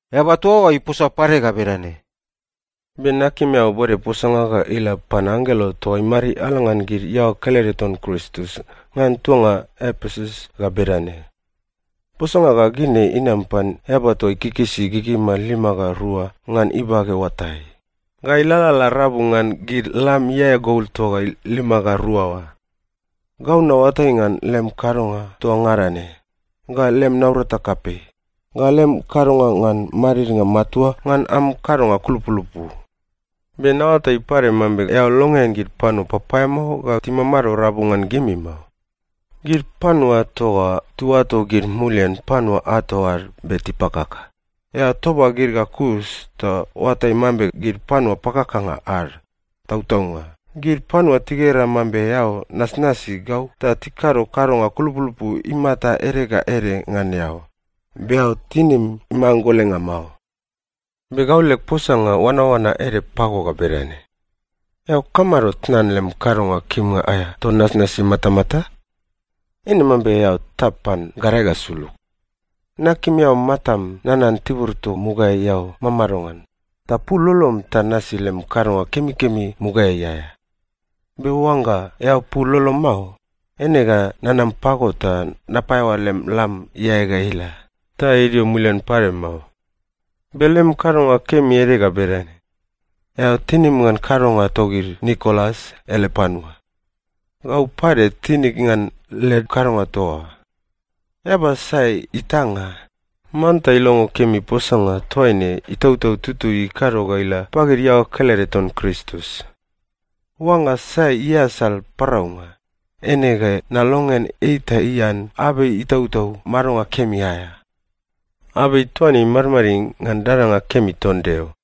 Eaba toa oa iposa pade ga bedane, “Be nakim eao bode posanga ga ila pan anggelo toa imariala ngan gid iaoa kelede ton Kristus ngan tuanga Epesus ga bedane: Posanga ga gid ne inam pan eaba toa ikikisi gigima lima ga rua ngan ibage oatai, ga ilalala rabu ngan gid lam iae gol toa lima ga rua oa. Gau naoatai ngan lem kadonga toa ngada ne, ga lem naurata kapei, ga lem kadonga ngan madidnga matua ngan am kadonga kulupulupu. Be naoatai pade mambe eao longean gid panua papaeamao ga timamado rabu ngan gimi mao. Gid panua toa oa tiuato gid mulian panua ato ad be tipakaka, eao toba gid ga kus ta oatai mambe gid panua pakakanga ad. Tautaunga, gid panua tigera mambe eao nasnasi gau ta tikado kadonga kulupulupu imata ede ga ede ngan eao, be eao tinim imanggolenga mao. Be gau leg posanga oanaoana ede pago ga bedane: Eao kamado tnan lem kadonga kimnga aea toa nasnasi matamata? Eine mambe eao tap pan gadae ga sulug. Nakim eao matam nanan tibur toa mugaeai eao mamado ngan, ta pul lolom ta nasi lem kadonga kemikemi mugaeai aea. Be oangga eao pul lolom mao, eine ga nanam pago ta napaeaoa lem lam iae ga ila, ta idio imuliai pade mao. Be lem kadonga kemi ede ga bedane: Eao tinim ngan kadonga togid Nikolas ele panua. Gau pade tinig ngan led kadonga toa oa. Eaba sai itanga, manta ilongo kemi posanga toaine Itautau Tutui ikado ga ila pagid iaoa kelede ton Kristus. Oangga sai iasal paraunga, eine ga nalongean ei ta ian abei itautau madonga kemi aea. Abei toa ne imadmadid ngan dadanga kemi ton Deo.”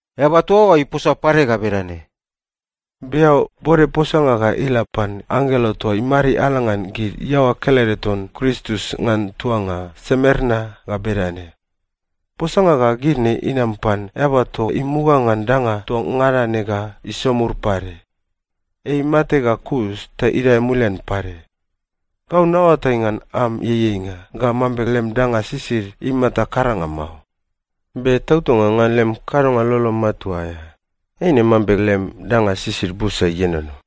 Eaba toa oa iposa pade ga bedane, “Be eao bode posanga ga ila pan anggelo toa imariala ngan gid iaoa kelede ton Kristus ngan tuanga Semerna ga bedane: Posanga ga gid ne inam pan Eaba toa imuga ngan danga toa ngada ne ga isomur pade. Ei imate ga kus ta idae mulian pade. Gau naoatai ngan am ieieinga ga mambe lem danga sisid imata karanga mao. Be tautaunga ngan lem kadonga lolo matua aea, eine mambe lem danga sisid busa ienono.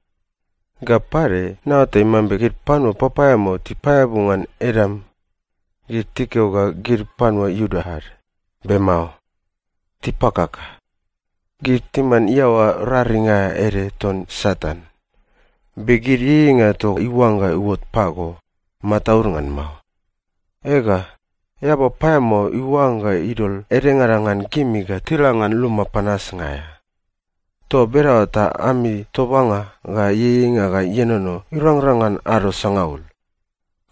Ga pade, naoatai mambe gid panua papaeamao tipaeabu ngan edam. Gid tikeo ga gid panua Iuda ad, be mao. Tipakaka. Gid timan iaoa raring aea ede ton Satan. Be gid ieieinga toa iuangga iuot pago, mataud ngan mao. Ega, eaba paeamao iuangga idol edengada ngan gimi ga tila ngan luma panasnga aea. Toa bedaoa ta ami tobanga ga ieieinga ga ienono irangrang ngan ado sangaul.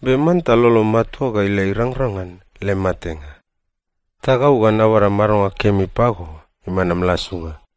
Be manta lolom matua ga ila irangrang ngan lem matenga. Ta gau ga nabada madonga kemi pago iman am lasunga.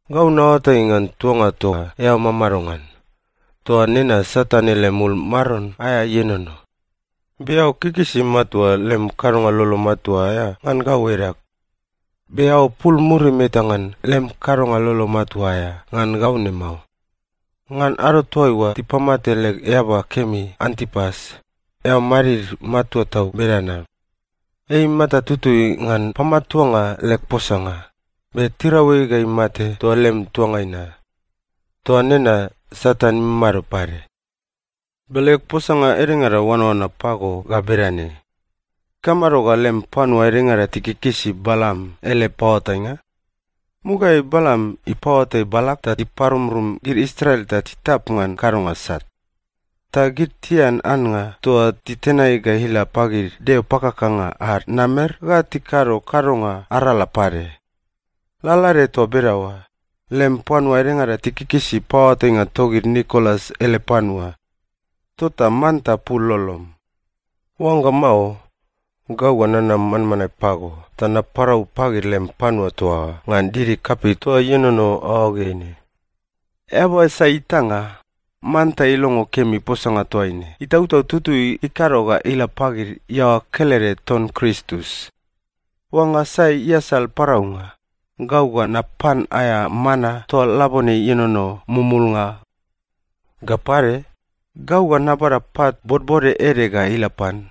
Gau naoatai ngan tuanga toa eao mamado ngan. Toa nena Satan ele mul maron aea ienono. Be eao kikisi matua lem kadonga lolo matua aea ngan gau edag. Be eao pul murim eta ngan lem kadonga lolo matua aea ngan gau ne mao. Ngan ado toaiua tipamate leg eaba kemi Antipas, eao madmadid matua toa bedana. Ei imata tutui ngan pamatuanga leg posanga, be tirau ei ga imate toa lem tuangai na. Toa nena Satan imamado pade. Be leg posanga edengada oanaoana pago ga bedane: Ikamado ga lem panua edengada tikikisi Balam ele paoatainga? Mugaeai Balam ipaoatai Balak ta iparumrum gid Israel ta titap ngan kadonga sat. Ta gid tian annga toa titenai ga ila pagid deo pakakanga ad namer ga tikado kadonga arala pade. Lalaede toa bedaoa, lem panua edengada tikikisi paoatainga togid Nikolas ele panua. Tota manta pul lolom. Oangga mao, gau ga nanam manmanae pago ta naparau pagid lem panua toa oa ngan didi kapei toa ienono aoageai ne. Eaba sai itanga, manta ilongo kemi posanga toaine Itautau Tutui ikado ga ila pagid iaoa kelede ton Kristus. Oangga sai iasal paraunga, gau ga napan aea mana toa labone ienono mumulnga. Ga pade, gau ga nabada pat bodbode ede ga ila pan.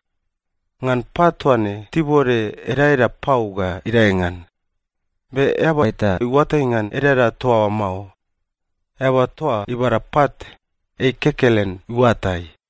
Ngan pat toa ne tibode edaeda pau ga idae ngan. Be eaba eta iuatai ngan edaeda toa oa mao. Eaba toa ibada pat, ei kekelen iuatai.”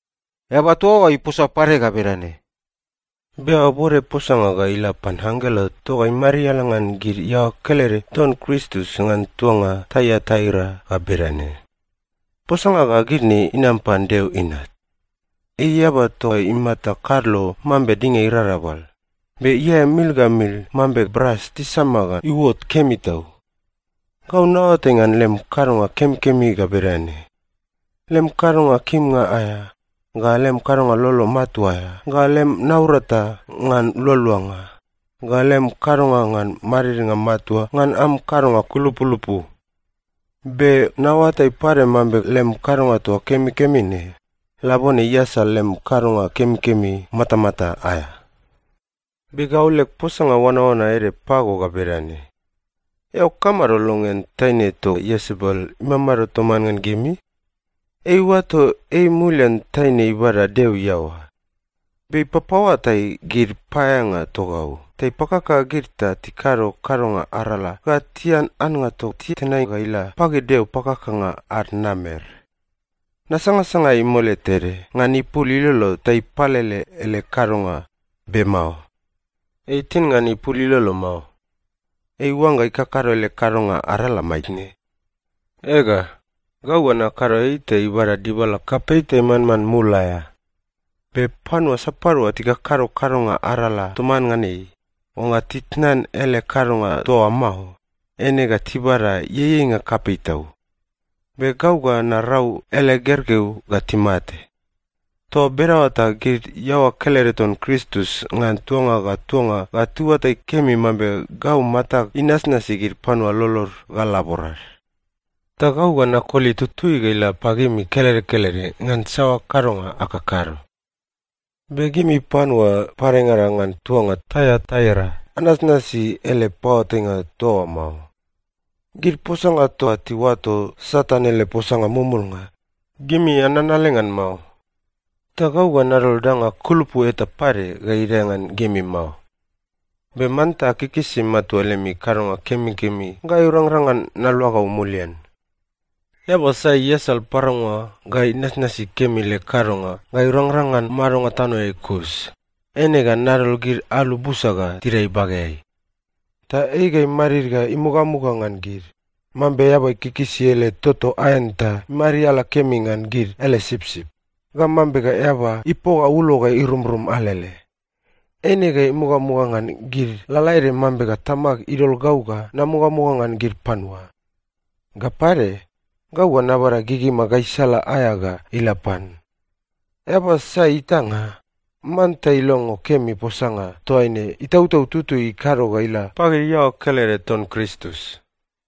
Eaba toa oa iposa pade ga bedane, “Be eao bode posanga ga ila pan anggelo toa imariala ngan gid iaoa kelede ton Kristus ngan tuanga Taiataira ga bedane: Posanga ga gid ne inam pan Deo Inat. Ei eaba toa imata kadlo mambe dinga irarabal, be iae mil ga mil mambe bras tisama ga iuot kemi tau. Gau naoatai ngan lem kadonga kemikemi ga bedane: lem kadonga kimnga aea, ga lem kadonga lolo matua aea, ga lem naurata ngan lualuanga, ga lem kadonga ngan madidnga matua ngan am kadonga kulupulupu. Be naoatai pade mambe lem kadonga toa kemikemi ne, labone iasal lem kadonga kemikemi matamata aea. Be gau leg posanga oanaoana ede pago ga bedane: Eao kamado longean taine toa Iesebel imamado toman ngan gimi? Ei iuato ei mulian taine ibada Deo iaoa. Be ei ipapaoatai gid paeaeanga togau ta ipakaka gid ta tikado kadonga arala ga tian annga toa titenai ga ila pagid deo pakakanga ad namer. Nasangasanga ei mole tede ngan ipul ilolo ta ipalele ele kadonga, be mao. Ei itin ngan ipul ilolo mao. Ei iuangga ikakado ele kadonga arala maitne. Ega, gau ga nakado ei ta ibada dibala kapei ta imanman mul aea. Be panua sapadua tikakado kadonga arala toman ngan ei, oangga titnan ele kadonga toa oa mao, eine ga tibada ieieinga kapei tau. Be gau ga narau ele gergeu ga timate. Toa bedaoa ta gid iaoa kelede ton Kristus ngan tuanga ga tuanga ga tiuatai kemi mambe gau matag inasnasi gid panua lolod ga laborad. Ta gau ga nakoli tutui ga ila pagimi kelede kelede ngan saoa kadonga akakado. Be gimi panua padengada ngan tuanga Taiataira anasnasi ele paoatainga toa oa mao. Gid posanga toa tiuato ‘Satan ele posanga mumulnga,’ gimi ananale ngan mao. Ta gau ga nadol danga kulupu eta pade ga idae ngan gimi mao. Be manta akikisi matua lemi kadonga kemikemi ga irangrang ngan naluagau mulian. Eaba sai iasal paraunga ga inasnasi kemi leg kadonga ga irangrang ngan madonga tanoeai kus, eine ga nadol gid alu busa ga tidae ibageai. ‘Ta ei ga imadid ga imugamuga ngan gid, mambe eaba ikikisi ele toto aen ta imariala kemi ngan gid ele sipsip, ga mambe eaba ipoga ulo ga irumrum alele.’ Eine ga imugamuga ngan gid lalaede mambe Tamag idol gau ga namugamuga ngan gid panua. Ga pade, gau ga nabada gigima gaisala aea ga ila pan. Eaba sai itanga, manta ilongo kemi posanga toaine Itautau Tutui ikado ga ila pagid iaoa kelede ton Kristus.”